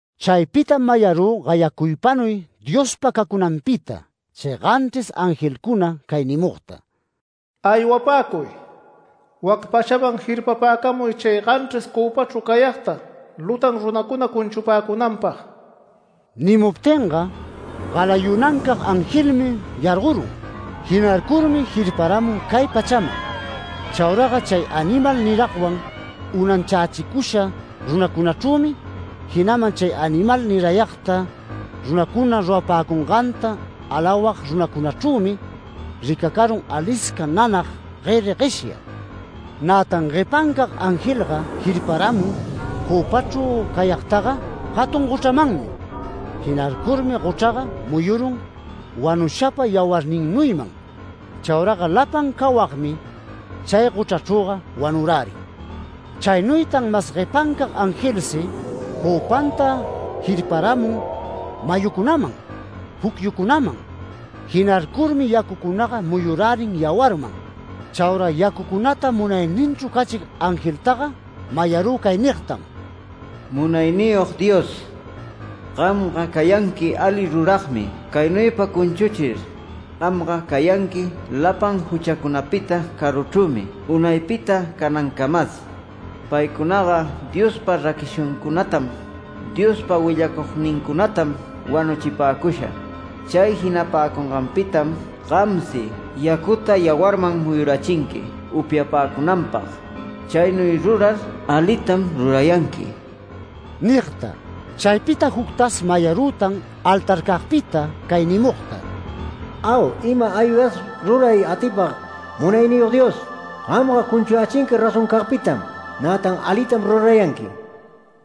Chaypitam mayarü gayacuypanuy Diospa cacunanpita, chay ganchris angelcuna cay nimugta: “Aywapäcuy, wac pachaman jirpapäcamuy chay ganchris cöpachru cayagta lutan runacuna cunchupäcunanpag”. Nimuptinga galayunancag angelmi yargorun. Jinarcurmi jirparamun cay pachaman. Chauraga chay animal niragwan unanchächicusha runacunachrümi jinaman chay animal nirayagta runacuna rurapäcunganta alawag runacunachrümi, ricacarun alisca nanag gueri gueshya. Nätan guepancag angelga jirparamun cöpachru cayagtaga jatun gochramanmi. Jinarcurmi gochraga muyurun wanushapa yawarninnuyman. Chauraga lapan cawagmi chay gochrachrüga wanurärin. Chaynuytan mas guepancag angelsi cöpanta jirparamun mayucunaman, pucyucunaman. Jinarcurmi yacucunaga muyurärin yawarman. Chaura yacucunata munayninchru cachig angeltaga mayarü cay nigtam: “Munayniyog Dios, gamga cayanqui ali ruragmi caynuypa cunchuchir. Gamga cayanqui lapan juchacunapita caruchrümi unaypita canancamas. Paycunaga Diospa raquishancunatam, Diospa willacugnincunatam wanuchipäcusha, chay jinapäcunganpitam gamsi yacuta yawarman muyurachinqui upyapäcunanpag. Chaynuy rurar alitam rurayanqui” nigta. Chaypita juctas mayarütan altarcagpita cay nimugta: “Au, ima-aygas ruray atipag Munayniyog Dios, gamga cunchuyächinqui razoncagpitam, nätan alitam rurayanqui”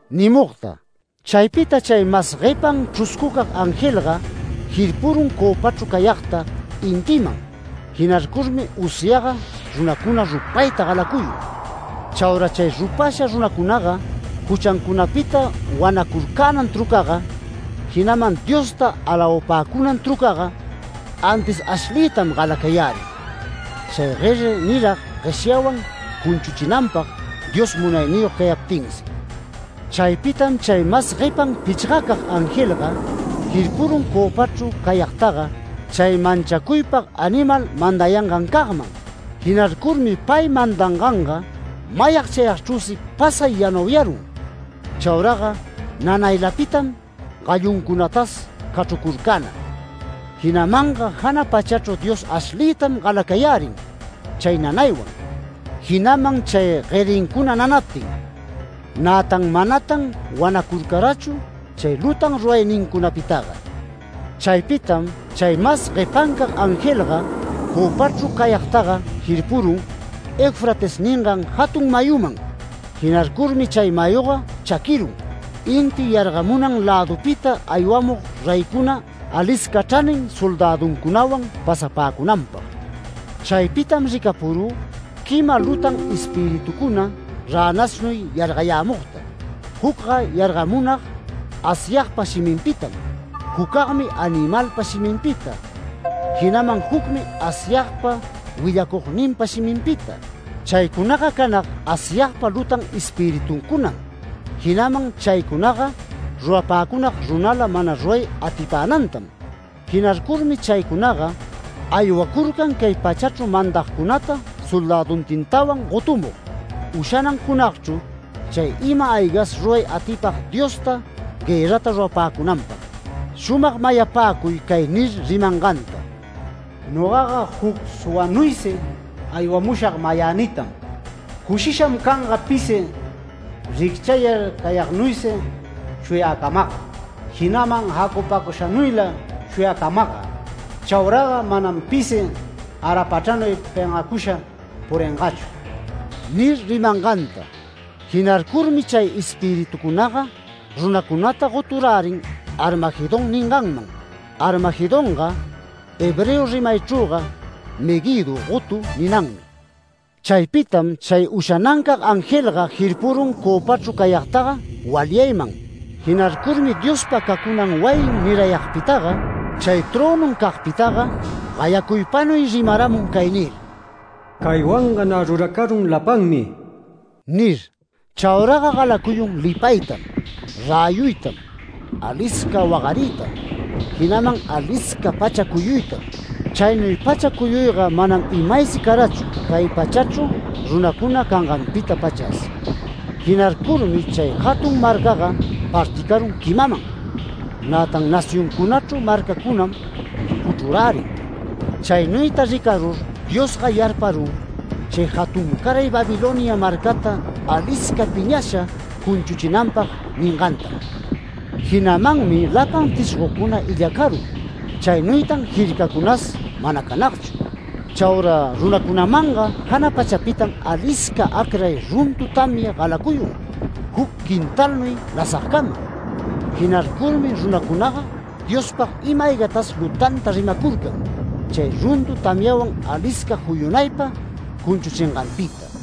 nimugta. Chaypita chay mas guepan chruscucag angelga jirpurun cöpachru cayagta intiman, jinarcurmi usyaga runacuna rupayta galacuyun. Chaura chay rupasha runacunaga, juchancunapita wanacurcänan trucaga, jinaman Diosta alawapäcunan trucaga antis ashliytam galacayärin, chay gueri nirag gueshyawan cunchuchinanpag Dios munayniyog cayaptinsi. Chaypitam chay mas guepan pichgacag angelga, jirpurun cöpachru cayagtaga, chay manchacuypag animal mandayangancagman. Jinarcurmi pay mandanganga mayag chayagchrüsi pasay yanauyarun. Chauraga nanaylapitam galluncunatas cachrucurcänag. Jinamanga jana pachachru Dios ashliytam galacayärin chay nanaywan, jinaman chay guerincuna nanaptin. Nätan manatan wanacurcarachu chay lutan ruraynincunapitaga. Chaypitam chay mas guepancag angelga cöpachru cayagtaga jirpurun, Eufrates ningan jatun mayuman. Jinarcurmi chay mayuga chaquirun, inti yargamunan lädupita aywamug reycuna alisca chranin soldäduncunawan pasapäcunanpag. Chaypitam ricapurü quima lutan espiritucuna ränasnuy yargamugta. Jucga yargamunag Asyagpa shiminpitam, jucagmi animalpa shiminpita, jinaman jucmi Asyagpa willacugninpa shiminpita. Chaycunaga canag Asyagpa lutan espirituncunam, jinaman chaycunaga rurapäcunag runala mana ruray atipänantam. Jinarcurmi chaycunaga aywacurcan cay pachachru mandagcunata soldäduntintawan gotumug, ushanan junagchru chay ima-aygas ruray atipag Diosta guërrata rurapäcunanpag. Shumag mayapäcuy cay nir rimanganta: “Nogaga juc suwanuysi aywamushag mayänitam. Cushisham canga pisi ricchayar cayagnuysi shuyäcamagga, jinaman jacupacushanuyla shuyäcamagga. Chauraga manam pisi garapachranuy pengacusha puringachu” nir rimanganta. Jinarcurmi chay espiritucunaga runacunata goturärin ‘Armagedón’ ninganman. ‘Armagedonga’ hebreo rimaychrüga ‘Meguido’ gotu ninanmi. Chaypitam chay ushanancag angelga jirpurun cöpachru cayagtaga walyayman. Jinarcurmi Diospa cacunan wayin nirayagpitaga, chay trönuncagpitaga, gayacuypanuy rimaramun cay nir: “Caywanga nä ruracarun lapanmi” nir. Chauraga galacuyun lipaytam, räyuytam, alisca wagariytam, jinaman alisca pacha cuyuytam. Chaynuy pacha cuyuyga manam imaysi carachu cay pachachru runacuna canganpita-pachas. Jinarcurmi chay jatun marcaga particarun quimaman. Nätan nacioncunachru marcacunam juchrurärin. Chaynuyta ricarur Diosga yarparun, chay jatuncaray Babilonia marcata alisca piñasha cunchuchinanpag ningantam. Jinamanmi lapan tishgocuna illacarun. Chaynuytan jircacunas mana canagchu. Chaura runacunamanga jana pachapitam alisca acray runtu tamya galacuyun, juc quintalnuy lasagcama. Jinarcurmi runacunaga Diospag ima-aygas lutanta rimacurcan, chay runtu tamyawan alisca juyunaypa cunchuchinganpita.